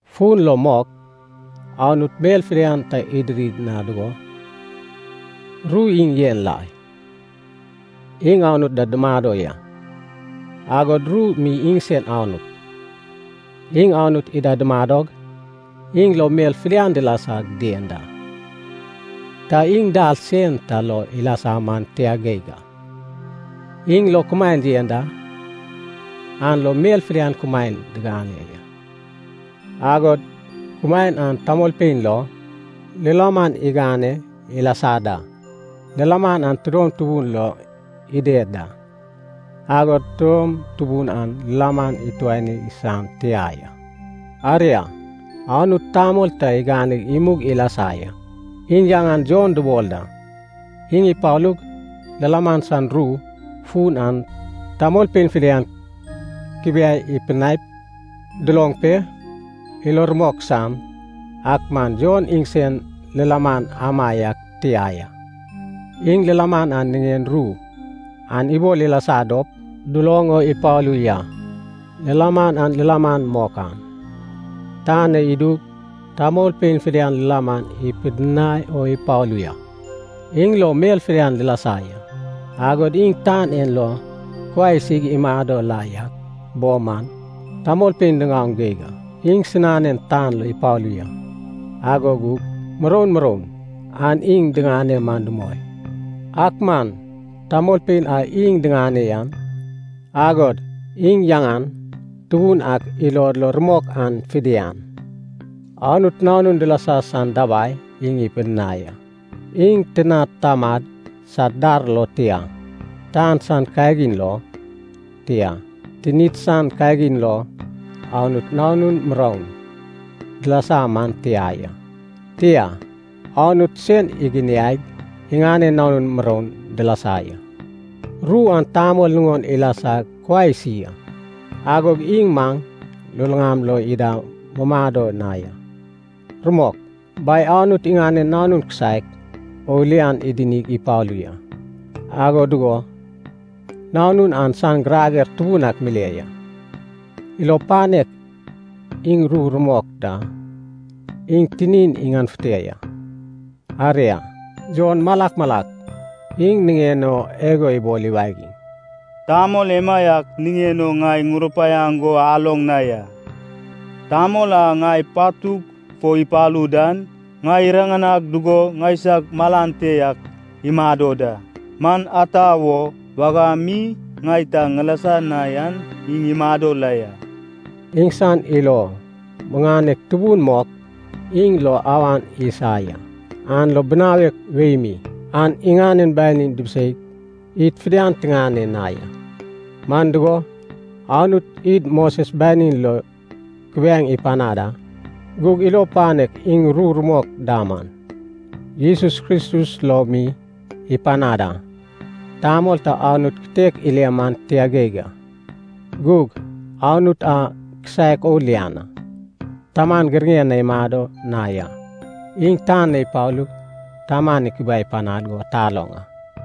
Fun lo mok Anut mel fidian ta idiri na dugo, Ru iŋ yen la ya. Iŋ Anut da dumado ya, agod Ru mi iŋsen Anut. Iŋ Anut ida dumadog, iŋ lo mel fidian dilasag dien da. Ta iŋ dal sen ta lo ilasa man tia geig a. Iŋ lo kumaen yen da, an lo mel fidian kumaen diŋane ya, agod kumaen an tamolpein lo lilaman igane ilasa da. Lilaman an tidom tubun lo ided da, agod tidom tubun an lilaman ituani san tia ya. Aria, Anut tamol ta iganeg imug ilasa ya. Iŋ yaŋan Jon dubol da. Iŋ ipalug, lilaman san ru fun an tamolpein fidian ikubiai ipidinaip, duloŋ pe, ilod lo rumok san. Ak man Jon iŋsen lilaman amaiak tia ya. Iŋ lilaman an niŋen ru an ibol ilasa dop duloŋ o ipalu ya. Lilaman a lilaman mok an, tan na idup tamolpein fidian lilaman ipidinai o ipalu ya. Iŋ lo mel fidian dilasa ya, agod iŋ tan en lo kuai isig imado la yak bo man, tamolpein diŋaoŋ geig a. Iŋsinanen tan lo ipalu ya, ago gug muroun muroun an iŋ diŋane man dumoi. Ak man tamolpein a iŋ diŋane yan, agod iŋ yaŋan tubun ak ilod lo rumok an fidian, Anut nanun dilasa san dabai iŋ ipidinai a. Iŋ tinad tamad sad dar lo, tia, tan san kagin lo, tia, tinid san kagin lo, Anut nanun muroun dilasa man tia ya. Tia, Anut sen iginiaig, iŋanen nanun muroun dilasa ya. Ru an tamol nuŋon ilasag kuai isi a. Agog iŋ maŋ luluŋama lo ida mumado na ya. Rumok, Bai Anut iŋanen Nanun kisaek o lian idinig ipalu ya, ago dugo Nanun an san girager tubun ak mile ya. Ilo panek iŋ ru rumok da iŋ tinin iŋanefute ya. Aria, Jon malak malak iŋ niŋen o igo ibol iwagiŋ, “Tamol emaiak niŋen o ŋai ŋurupaiaŋ go aloŋ na ya. Tamol a ŋai patug fo ipalu dan, ŋai iriŋanag dugo ŋaisag malan te yak imado da. Man ata wo, wagam mi ŋai ta ŋilasa na yan iŋ imado la ya.” Iŋsan ilo muŋanek tubun mok iŋ lo awan isa ya, an lo binawek wei mi an iŋanen banin dibiseig id fidian tiŋane na ya. Man dugo, Anut id Moses banin lo kubiaeŋ ipanad a, gug ilo panek iŋ ru rumok da man, Jesus Kristus lo mi ipanad a. Tamol ta Anut kitek ile man tia geig a. Gug Anut a kisaek o lian an, Taman giraŋen na imado na ya, iŋ tan na ipalug Taman ikubiai panad go taloŋ a.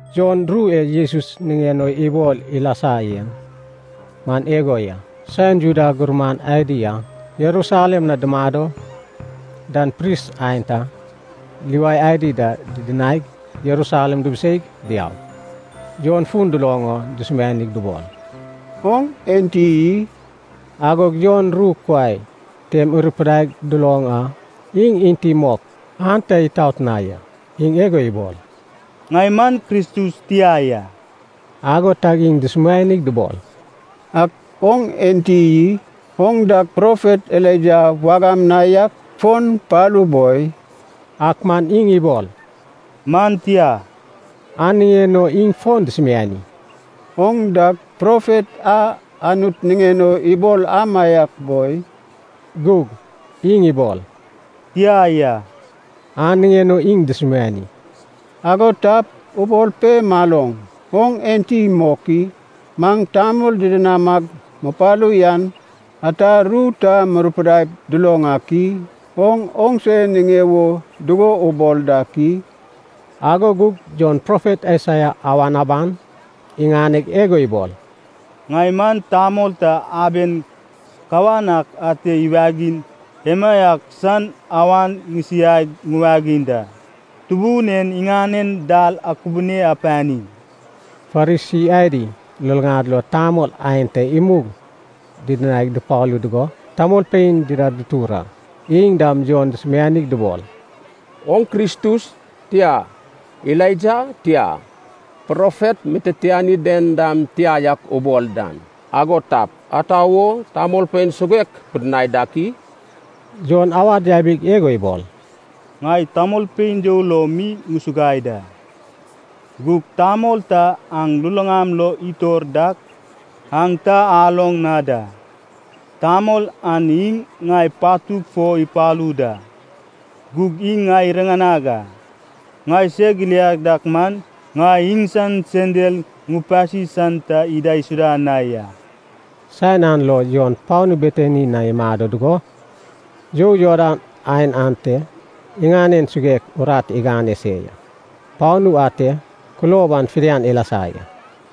Jon ru e Jesus niŋen o ibol ilasa yen man igo ya. Saen Juda gurman adi a Jerusalem na dumado dan pris aenta, Liwai adi da didinaig Jerusalem dubuseig diaug, Jon fun duloŋ o dusumianig dubol, “Oŋ enti i?” Agog Jon ru kuai tem irupidaig duloŋ a, iŋ enti mok an ta itot na ya. Iŋ igo ibol, “Ŋai man Kristus tia ya.” Ago tag iŋ dusumianig dubol, “Ak oŋ enti i? Oŋ dag profet Elaija wagam na yak fon palu boi?” Ak man iŋ ibol, “Man tia.” An niŋen o iŋ fon dusumiani, “Oŋ dag profet a Anut niŋen o ibol amaiak boi?” Gug iŋ ibol, “Tia ya.” An niŋen o iŋ dusumiani, “Ago tap, ubol pe maloŋ, oŋ enti mok i? Maŋ tamol didinamag mupalu yan ata ru ta murupidaip duloŋ ak i? Oŋ oŋse niŋe wo dugo ubol dak i?” Ago gug Jon profet Aisaia awan aban iŋaneg igo ibol, “Ŋai man tamol ta aben kawan ak ate iwagiŋ emaiak san awan ŋisiaig ŋuwagiŋ da, ‘Tubun en iŋanen dal akubune apani!’” Farisi adi luluŋad lo tamol aenta imug didinaig dupalu dugo, tamolpein dida dutur a. Iŋ dam Jon dusumianig dubol, “Oŋ Kristus, tia, Elaija, tia, Profet mititiani den dam tia yak ubol dan, ago tap, ata wo tamolpein suguek pidinai dak i?” Jon awad yabig igo ibol, “Ŋai tamolpein you lo mi ŋusuguai da. Gug tamol ta aŋ luluŋam lo itor dak aŋ ta aloŋ na da. Tamol an iŋ ŋai patug fo ipalu da, gug iŋ ŋai iriŋanag a. Ŋai seg iliag dak man, ŋai iŋsan sendal ŋupasi san ta idaisuda na ya.” Saen an lo Jon panu Betani na imado dugo, you Jordan aen ate iŋanen suguek urat igane se ya. Panu ante kulob an fidian ilasa ya.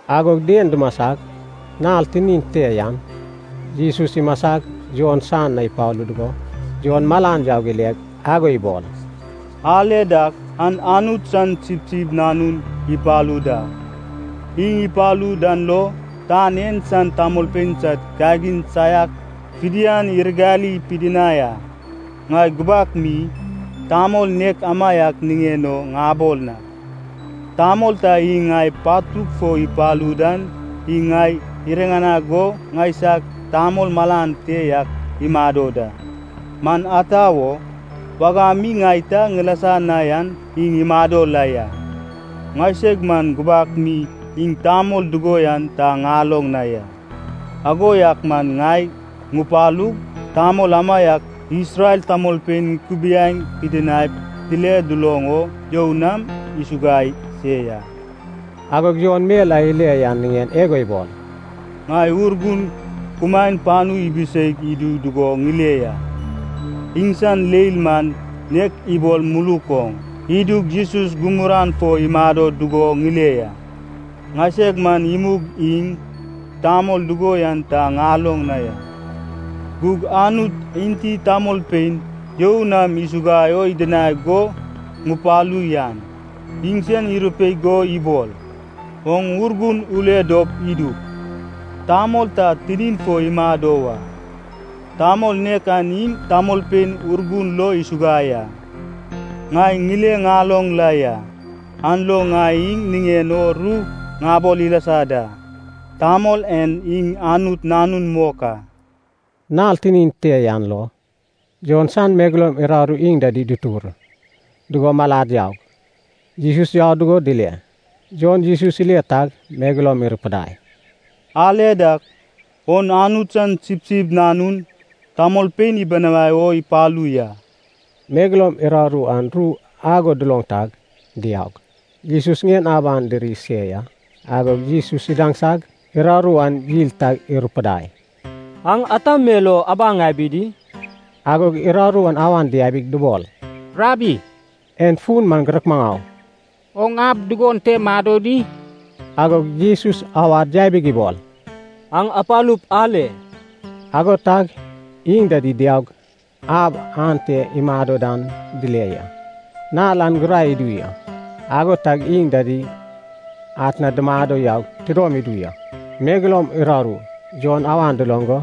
Agog dien dumasag nal tinin te yan, Jesus imasag Jon san na ipalu dugo, Jon malan yaug ile, agog ibol, “Ale dak, an Anut san sipsip nanun ipalu da. Iŋ ipalu dan lo, tan en san tamolpein sad kagin saiak fidian iragali pidinai a. Ŋai gubak mi tamol nek amaiak niŋen o ŋabol a. ‘Tamol ta iŋ ŋai patug fo ipalu dan iŋ ŋai iriŋanag go ŋaisag tamol malan te yak imado da. Man ata wo, wagam mi ŋai ta ŋilasa na yan iŋ imado la ya.’ Ŋaiseg man gubak mi iŋ tamol dugo yan ta ŋaloŋ na ya. Ago yak man ŋai ŋupalug, tamol amaiak Isrel tamolpein ŋukubiai pidinaip dile duloŋ o, you nam ŋusuguai se ya.” Agog Jon mel a ile yan niŋen igo ibol, “Ŋai Urgun kumaen panu ibiseig idu dugo ŋile ya. Iŋsan leil man nek ibol muluk oŋ idug Jesus gumuran fo imado dugo ŋile ya. Ŋaiseg man imug iŋ tamol dugo yan ta ŋaloŋ na ya. Gug Anut enti tamolpein you nam ŋusuguai o idinag go ŋupalu yan, iŋsen irupaiag go ibol, ‘Oŋ Urgun ule dop idup, tamol ta tinin fo imado wa. Tamol nek an iŋ tamolpein Urgun lo isuguai a.’ Ŋai ŋile ŋaloŋ la ya, an lo ŋai iŋ niŋen o ru ŋabol ilasa da, tamol en iŋ Anut Nanun mok a.” Nal tinin te yan lo, Jon san megeloum uraru iŋ dida dutur dugo malad yaug, Jesus yau dugo dile. Jon Jesus ile tag megeloum irupudai, “Ale dak, on Anut san sipsip nanun, tamolpein ibinawai o ipalu ya.” Megeloum uraru an ru ago duloŋ tag, diaug, Jesus ŋien aban diri se ya. Agog Jesus idaŋsag, uraru an yil tag irupudai, “Aŋ ata mel o abaŋ abi di?” Agog uraru an awan diabig dubol, “Rabbi (en fun man girek maŋau) oŋ ab dugon te mado di?” Agog Jesus awad yabig ibol, “Aŋ apalup ale.” Ago tag iŋ dida diaug, ab a ate imado dan dile ya. Nal an gurai idu ya, ago tag iŋ dida atna dumado yaug tidom idu ya. Megeloum uraru Jon awan duloŋ go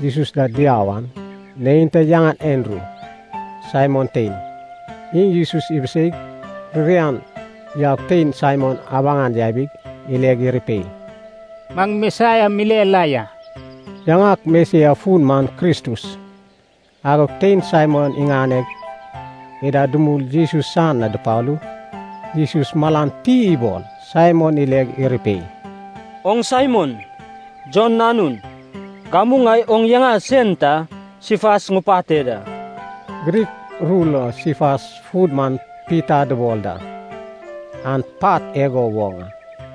Jesus da diau an, neinta yaŋan Andru, Saimon tein. Iŋ Jesus ibiseig ririan yaug tein Saimon abaŋan yabig, ileg irupei, “Maŋ Mesias mile la ya.” (Yaŋak Mesias fun man Kristus.) Agog tein Saimon iŋaneg, ida dumul Jesus san na dupalu. Jesus malan ti ibol Saimon ileg irupei, “Oŋ Saimon, Jon nanun. Gamu ŋai oŋ yaŋa sen ta Sifas ŋupate da.” (Grik ru lo Sifas fun man Pita dubol da, an “pat” igo woŋ a.)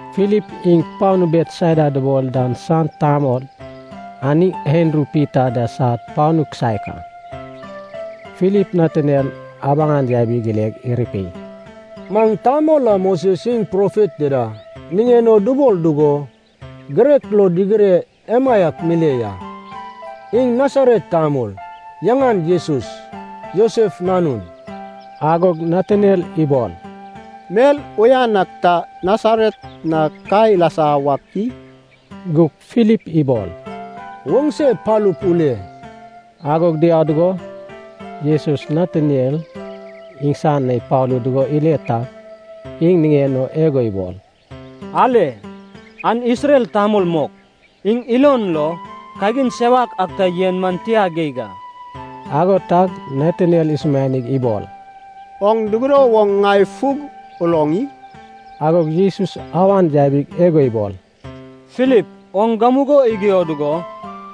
Filip iŋ panu Betsaida dubol dan san tamol, an iŋ Andru Pita da sad panu kisaek a. Filip Nataniel abaŋan yabig ileg irupei, “Maŋ tamol a Moses iŋ profet dida niŋen o dubol dugo, girek lo digire emaiak mile la ya. Iŋ Nasaret tamol, yaŋan Jesus, Josef nanun.” Agog Nataniel ibol, “Mel uyan ak ta Nasaret na ka ilasa wak i?” Gug Filip ibol, “Oŋse palup ule.” Agog diau dugo, Jesus Nataniel iŋsan na ipalu dugo ile tag, iŋ niŋen o igo ibol, “Ale, an Isrel tamol mok. Iŋ ilon lo kagin sewak ak ta yen man tia geig a.” Ago tag Nataniel isumianig ibol, “Oŋ dugudo woŋ ŋai fug uloŋ i?” Agog Jesus awan yabig igo ibol, “Filip oŋ gamugo igio dugo,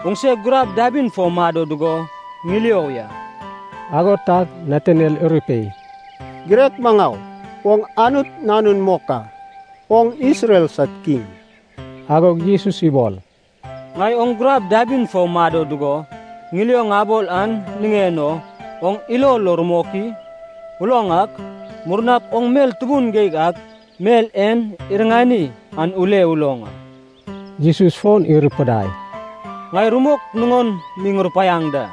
oŋse gurab dabin fo mado dugo ŋilio ya.” Ago tag Nataniel irupei, “Girek Maŋau, oŋ Anut Nanun mok a, oŋ Isrel sad Kiŋ.” Agog Jesus ibol, “Ŋai oŋ gurab dabin fo mado dugo, ŋilio ŋabol an niŋen o oŋ ilo lo rumok i? Uloŋ ak, murnap oŋ mel tubun geig ak mel en iriŋani an ule uloŋ a.” Jesus fon irupudai, “Ŋai rumok nuŋon mi ŋurupaiaŋ da.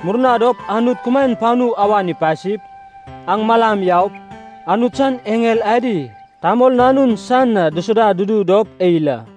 Murna dop Anut kumaen panu awan ipasip, aŋ malam yaup, Anut san eŋel adi Tamol Nanun san na dusuda dudu dop eil a.”